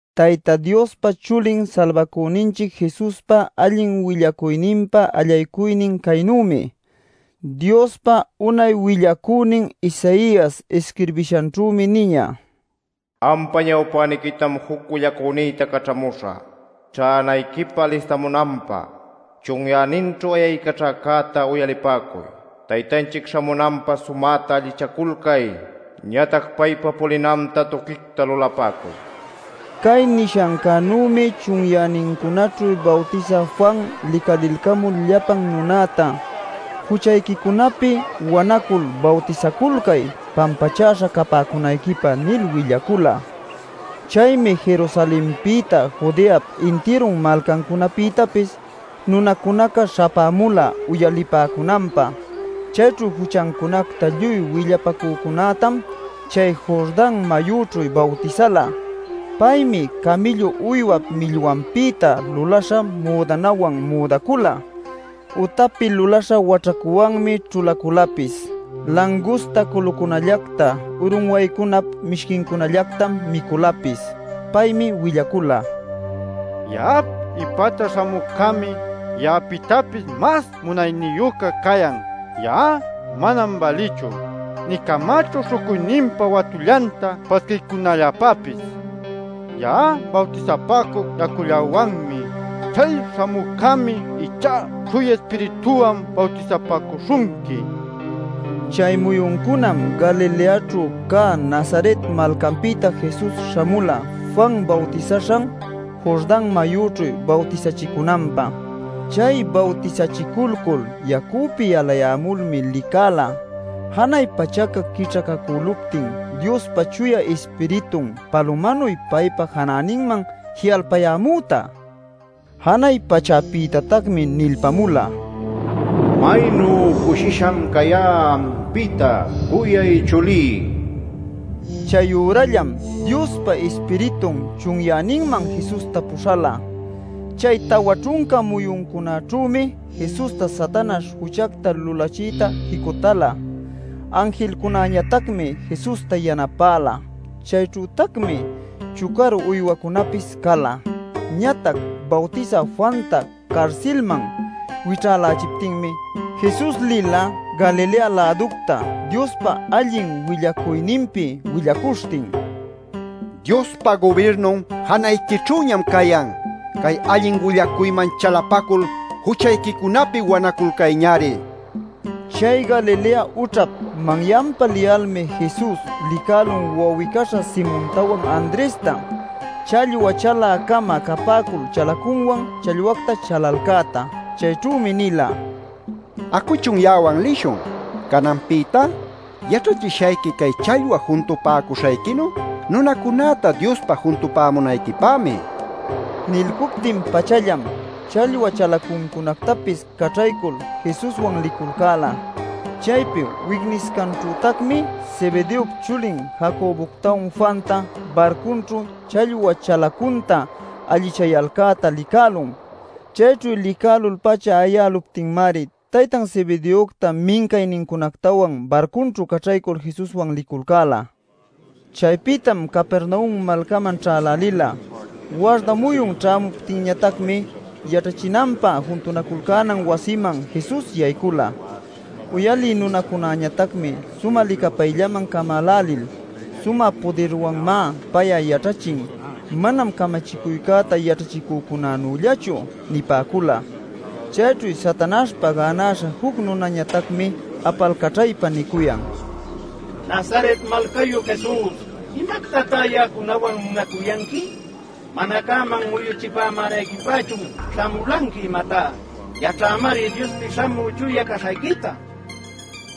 Tayta Diospa Chulin Salbacüninchic Jesuspa allin willacuyninpa allaycuynin caynümi. Diospa unay willacünin Isaias isquirbishanćhümi niñä: “Ampa ñawpäniquitam juc willacünïta caćhamüśhä, ćhänayquipä alistamunanpä. Chunyäninćhu ayaycaćhäcäta uyalipäcuy: ‘Taytanchic ćhämunanpä sumäta allichaculcay. Ñatac paypa pulinanta tuquicta lulapäcuy’” nil. Cay nishancänümi chunyänincunaćhu Bawtisä Juan licalilcamul llapan nunäta: “Juchayquicunapi wanacul bawtisaculcay pampachäśha capäcunayquipä” nil willacula. Chaymi Jerusalenpïta Judeap intirun malcancunapïtapis nunacunaca śhapämula uyalipäcunanpä. Chayćhu juchancunacta lluy willapacücunätam chay Jordan mayućhu bawtisala. Paymi camïllu uywap millwanpïta luläśha müdanawan müdacula; utapi luläśha waćhacuwanmi ćhulaculapis. Langusta culucunallacta urunwaycunap mishquincunallactam miculapis. Paymi willacula: “Ya'ap ipäta śhamücämi ya'apïtapis mas munayniyüca cayan. Ya'a manam bälïchu nï camächu śhucuyninpa watullanta pasquiycunalläpäpis. Ya'a bawtisapäcuc yacullawanmi. Chay śhamücämi ichá Chuya Ispirituwan bawtisapäcuśhunqui” nil. Chay muyuncunam Galileaćhu cä Nazaret malcanpïta Jesus śhamula Juan bawtisaśhan Jordan mayüćhu bawtisachicunanpä. Chay bawtisachiculcul yacüpi yalayämulmi licäla janay pachaca quićhacacüluptin Diospa Chuya Ispiritun palumanuy paypa janäninman ji'alpayämüta. Janay pachäpïtatacmi nilpämula: “¡Maynu cushisham cayá ampïta, cuyay chulí!” nil. Chayürallam Diospa Ispiritun chunyäninman Jesusta puśhala. Chay tawa ćhunca muyuncunaćhümi Jesusta Satanaśh juchacta lulachiyta jicutäla. Anjilcunañatacmi Jesusta yanapäla. Chayćhütacmi chucaru uywacunapis cala. Ñatac Bawtisä Juanta carsilman wićhälächiptinmi, Jesus lila Galilea-läducta Diospa allin willacuyninpi willacuśhtin: “¡Diospa gubirnun janayquićhüñam cayan! ¡Cay allin willacuyman chalapacul juchayquicunapi wanaculcayñari!” nil. Chay Galilea ućhap manyanpa liyalmi Jesus licälun wawi-caśha Simontawan Andresta, challwa chalä-cama capäcul chalacunwan challwacta chalalcäta. Chayćhümi nila: “Acuchun ya'awan lishun. Cananpïtá yaćhachishayqui cay challwa juntupäcuśhayquinu nunacunäta Diospä juntupämunayquipämi” nil. Nilcuptin-pachallam challwa chalacuncunactapis caćhaycul Jesuswan liculcäla. Chaypi wicniscanćhütacmi Zebedeop chulin Jacoboctawan Juanta barcunćhu challwa chalacunta allichayalcäta licälun. Chayćhu licälul-pacha ayäluptinmari taytan Zebedeocta mincaynincunactawan barcunćhu caćhaycul Jesuswan liculcäla. Chaypïtam Capernaum malcaman ćhälälila. Warda muyun ćhämuptinñatacmi yaćhachinanpä juntunaculcänan wasiman Jesus yaycula. Uyalï nunacunäñatacmi sumä licapayllaman camälälil: “Sumä pudirwanmá pay'a yaćhachin; manam camachicuycäta yaćhachicücunanüllachu” nipäcula. Chayćhu Satanaśhpa gänaśha juc nunäñatacmi apalcaćhaypa nicuyan: “¡Nazaret malcayu, Jesus! ¿Imactatá ya'acunawan munacuyanqui? ¿Mana cäman muyuchipämänayquipächun śhamulanqui, imatá? Yaćhämari Diospi Śhamü Chuyaca caśhayquita”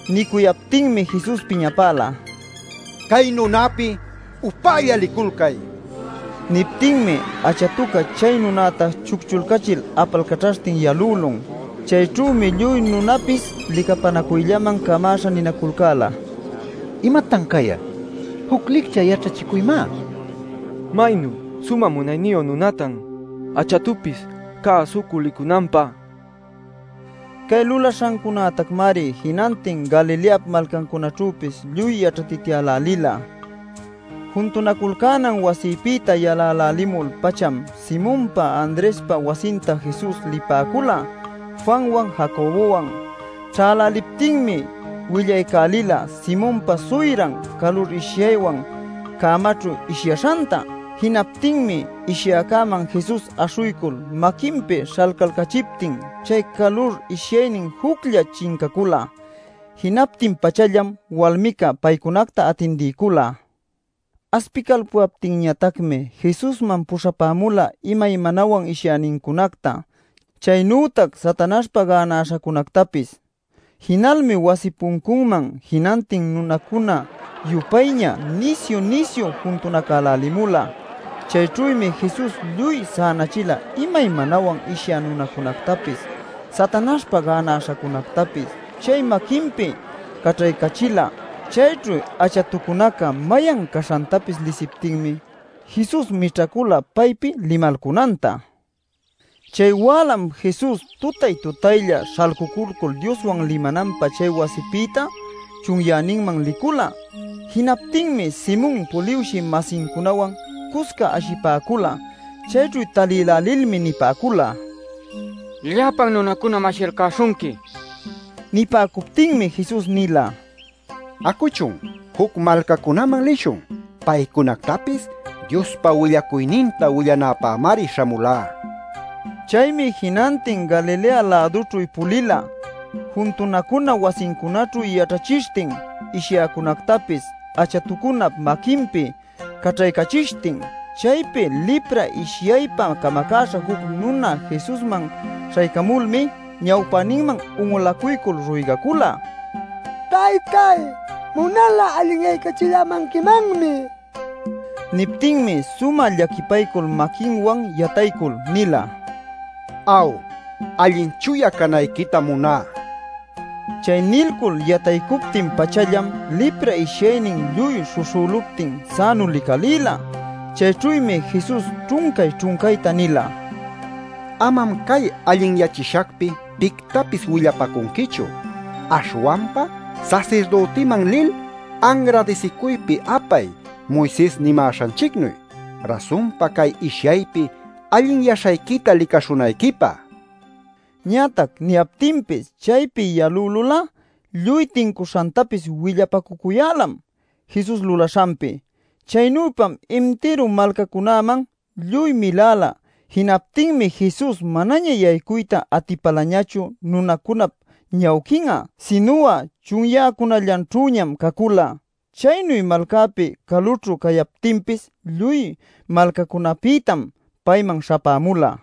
nil. Nicuyaptinmi Jesus piñapäla: “¡Cay nunäpi upälla liculcay!” nil. Niptinmi achatuca chay nunäta chucchulcachil apalcaćhaśhtin yalülun. Chayćhümi lluy nunapis licapänacuyllaman camäśha ninaculcäla: “¡Imatan cay'a! ¡Juc licchä yaćhachicuymá! ¡Maynu sumä munayniyu nunatan, achatupis cäsucul licunanpä!” nil. Cay lulaśhancunactamari jinantin Galileap malcancunaćhüpis lluy yaćhatityälälila. Juntunaculcänan wasipïta yalälälimul-pacham Simonpa Andrespa wasinta Jesus lipäcula Juanwan, Jacobowan. Ćhäläliptinmi willaycälila Simonpa suyran calur ishyaywan cämanćhu ishyaśhanta. Jinaptinmi ishyäcäman Jesus aśhuycul maquinpi śhalcalcachiptin chay calur ishyaynin juclla chincacula. Jinaptin-pachallam walmica paycunacta atindiycula. Aspicalpuyaptinñatacmi Jesusman puśhapämula imaymanawan ishyänincunacta, chaynütac Satanaśhpa gänaśhacunactapis. Jinalmi wasi puncunman jinantin nunacuna-yupayña nisyu-nisyu juntunacälälimula. Chayćhümi Jesus lluy sänachila imaymanawan ishyä nunacunätapis, Satanaśhpa gänaśhacunätapis chay maquinpi caćhaycachila. Chayćhu achatucunaca mayan caśhantapis lisiptinmi, Jesus mićhacula paypi limalcunanta. Chay wälam Jesus tutay-tutaylla śhalcuculcul Dioswan limananpä chay wasipïta chunyäninman licula. Jinaptinmi Simon puliwshï-masincunawan cusca ashipäcula. Chayćhu talïlälilmi nipäcula: “Llapan nunacunam ashiyalcäśhunqui” nil. Nipäcuptinmi Jesus nila: “Acuchun. Juc malcacunaman lishun; paycunactapis Diospa willacuyninta willanäpämari śhamulá” nil. Chaymi jinantin Galilea-lädućhu pulila juntunacuna wasicunaćhu yaćhachishtin ishyäcunactapis achatucunap maquinpi caćhaycachishtin. Chaypi lipra ishyaypa camacäśha juc nuna Jesusman ćhaycamulmi ñawpäninman un'ulacuycul ruygacula: “Taytáy munal'a allinyaycachillämanquimanmi” nil. Niptinmi sumä llaquipaycul maquinwan yataycul nila: “Aw, allin chuya canayquitam muná” nil. Chay nilcul yataycuptin-pachallam lipra ishyaynin lluy śhuśhüluptin sänu licalïla. Chayćhümi Jesus ćhuncay-ćhuncayta nila: “Amam cay allinyachishacpi pictapis willapacunquichu. Aśhwanpa sasirdütiman lil, anradisicuypi apay Moises nimäśhanchicnuy, rasunpa cay ishyaypi allinyäśhayquita licaśhunayquipä” nil. Ñatac niyaptinpis, chaypi yalülul'a lluy tincuśhantapis willapacucuyälam Jesus lulaśhanpi. Chaynüpam intiru malcacunaman lluy miläla. Jinaptinmi Jesus manaña yaycuyta atipalañachu nunacunap ñawquin'a, sinu'a chunyäcunallaćhüñam cacula. Chaynu malcapi calućhu cayaptinpis lluy malcacunapïtam payman śhapämula.